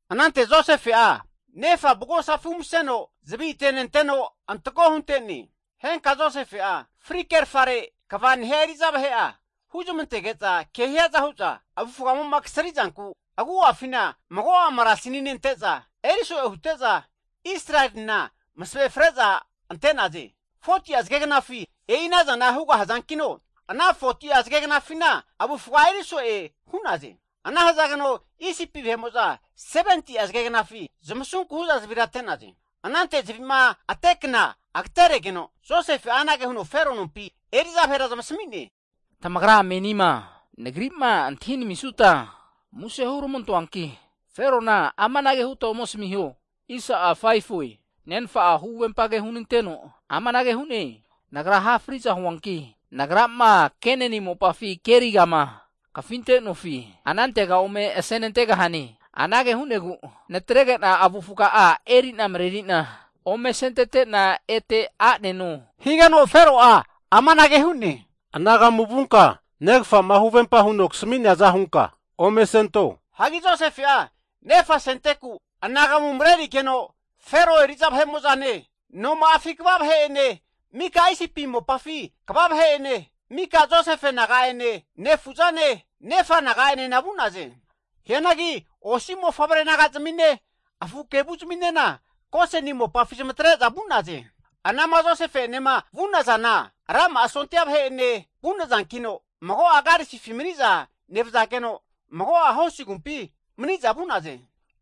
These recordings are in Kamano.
Anante Josefe'a nefa avugosafi umseno, zavi atenenteno antako hunte'ne. Henka Josefe'a fri kerfare kva nehia eri'za vahe'a huzmantege'za, kehiaza hu'za avufgamo'ma kasri'zanku agu'afina mago'a marasini nente'za eri so'e hute'za, Israelina (Jekopu) masave fre'za ante'naze. 40'a zage gnafi e'i anazana huga hazankino, ana foti'a zagegnafina avufga eri so'e hu'naze. Ana hazageno Isipi vahe'mo'za 70'a zagegnafi zamasunku hu'za zavira ate'naze. Anante zavi'ma atekna agateregeno, Josefe'a anage huno Fero nompi eri'za vahera zamasmi'ne, Tamagra menima nagri'ma antahi namisuta muse huramantoanki, Ferona amanage huta ome asmiho, Nenfa'a huvempa ke hunanteno amanage hu'ne, nagra ha fri'za huanki, nagrama Kenani mopafi kerigama kafinte'nofi anantega ome asenantegahane. Anage hu'negu natrege'na avufga'a eri'na mareri'na ome asentete'na, ete a'neno. Higeno Fero'a amanage hu'ne, Anagamu vunka negafa'ma huvempa huno kasmi'neaza hunka ome asento. Hagi Josefe'a nefa asenteku anagamu marerigeno, Fero eri'za vahe'mo'zane, noma'afi kva vahe'ene, mika Isipi mopafi kva vahe'ene, mika Josefe naga'ene, nefu'zane, nefa naga'enena vu'naze. Hianagi osi mofavre naga'zmine afu kevu zaminena Goseni mopafi zamatre'za vu'naze. Anama Josefe'enema vu'nazana rama'a sondia vahe'ene vu'nazankino, mago'a karisifi maniza nevazageno, mago'a hosi agumpifi mani'za vu'naze.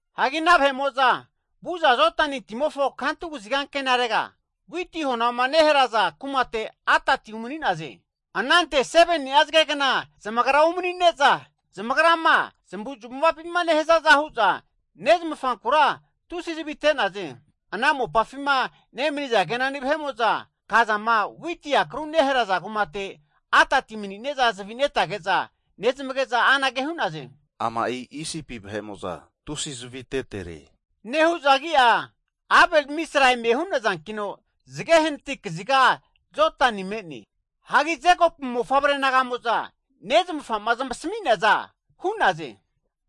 Hagi ana vahe'mo'za vu'za Jordani timofo kantu kaziga ankenarega, witi honama neharaza kumate Atadi umani'naze. Anante 7ni'a zage gna zamagra umanine'za, zamagrama zamavuzmavapima nehazaza hu'za, nezmanfankura tusi zavi ate'naze. Ana mopafima nemaniza Kenani vahe'mo'za kazama witi akru neharaza kumate Atadi mani''neza zavi netage'za nezmage'za anage hu'naze. Ama'i Isipi vahe'mo'za tusi'a zavi atetere, nehu'za agi'a Abel-mizraim hu'nazankino, zage hanati kaziga Jodani me'ne. Hagi Jekopu mofavre naga'mo'za nezmafa'ma zmasami'neaza hu'naze.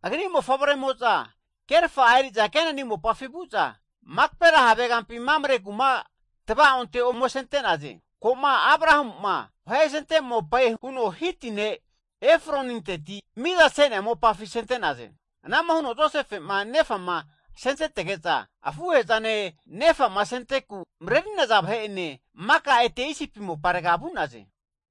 Agri mofavre'mo'za kerfa'a eri'za Kenani mopafi vu'za, Makapela havegampi Mamre kuma tvaonte ome asente'naze, ko'ma Abrahamu'ma vahe asente mopae huno Hiti ne' Efroninteti, miza hu'nea mopafi asente'naze. Ana'ma huno Josefe'ma nefama asentetege'za, afuhe'zane nefama asenteku mareri'naza vahe'ene maka ete Isipi moparega vu'naze.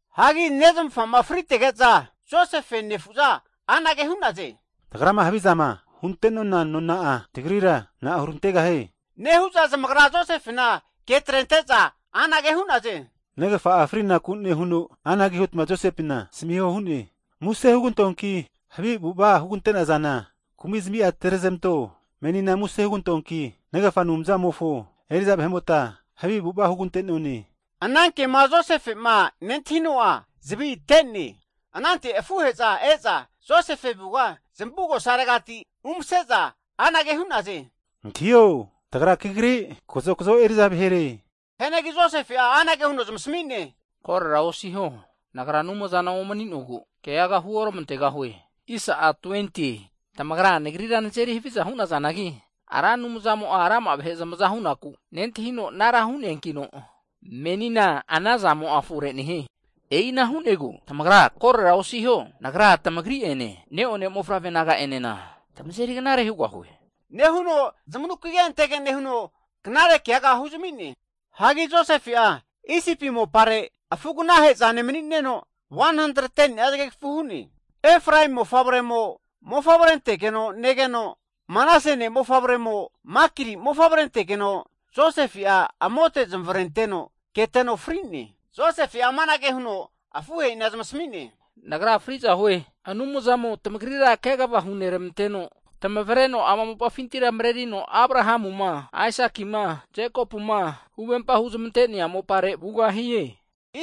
Hagi nezmafa'ma fritege'za, Josefe nefu'za anage hu'naze, tagrama havizama hunte'nona nona'a, tagrira na'a hurantegahie? Nehu'za zamagra Josefena ke atrente'za anange hu'naze, Negafa'a frinaku nehuno, anage huta Josefena asmiho hu'ne, muse (plis) hugantoanki, havi avu'ava hugante'nazana kumi zamia atre'zmanto. Menina muse (plis) hugantoanki, negafa Anumzamofo eri'za vahe'mota havi avu'ava hugante'none. Ana kema Josefe'ma nentahino'a zavi ate'ne. Anante afuhe'za e'za Josefe avuga zamugosaregati umase'za anage hu'naze, Antahio, tagra kagri kazokazo eri'za vahere. Hianagi Josefe'a anage huno zamasmi'ne, korora osiho, nagra Anumzana omani'nogu keaga huoramantegahue. Tamagra nagrira nazeri haviza hu'nazanagi, Ra Anumzamo'a rama'a vahe zamaza hunaku nentahino anara hu'neankino, menina ana zamo'a fore nehie. E'ina hu'negu tamagra korora osiho, nagra tamagri'ene, neone mofavre naga'enena tamazeri knare hugahue. Nehuno zamanukige antege nehuno, knare kegaga huzami'ne. Hagi Josefe'a Isipi mopare afu aganahezane mani'neno, 110ni'a zagegafu hu'ne. Efraemi mofavremo mofavre antegeno negeno, Manase ne'mofavre'mo Makiri mofavre antegeno Josefe'a amote zamavarenteno keteno fri'ne. Josefe'a amanage huno afuhe'ina zamasmi'ne, Nagra fri'za hue, Anumzamo tamagrira kegava huneramanteno, tamavreno ama mopafintira marerino Abrahamuma, Aisakima, Jekopuma huvempa huzmante'nea mopare vugahie.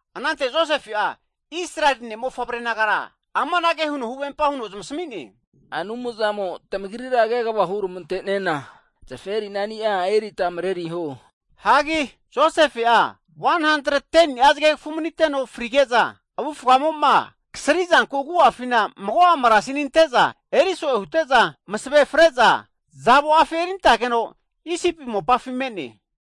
Anante Josefe'a Israeli ne'mofavre nagara amanage huno huvempa huno zamasmi'ne, Anumzamo tamagrira kegava huramante'nena zaferinani'a erita mareriho. Hagi Josefe'a 110ni'a zagegafu maniteno frige'za, avufgamo'ma kasrizanku agu'afina mago'a marasini ante'za eri so'e hute'za masave freza, zavoafi eri antageno Isipi mopafi me'ne.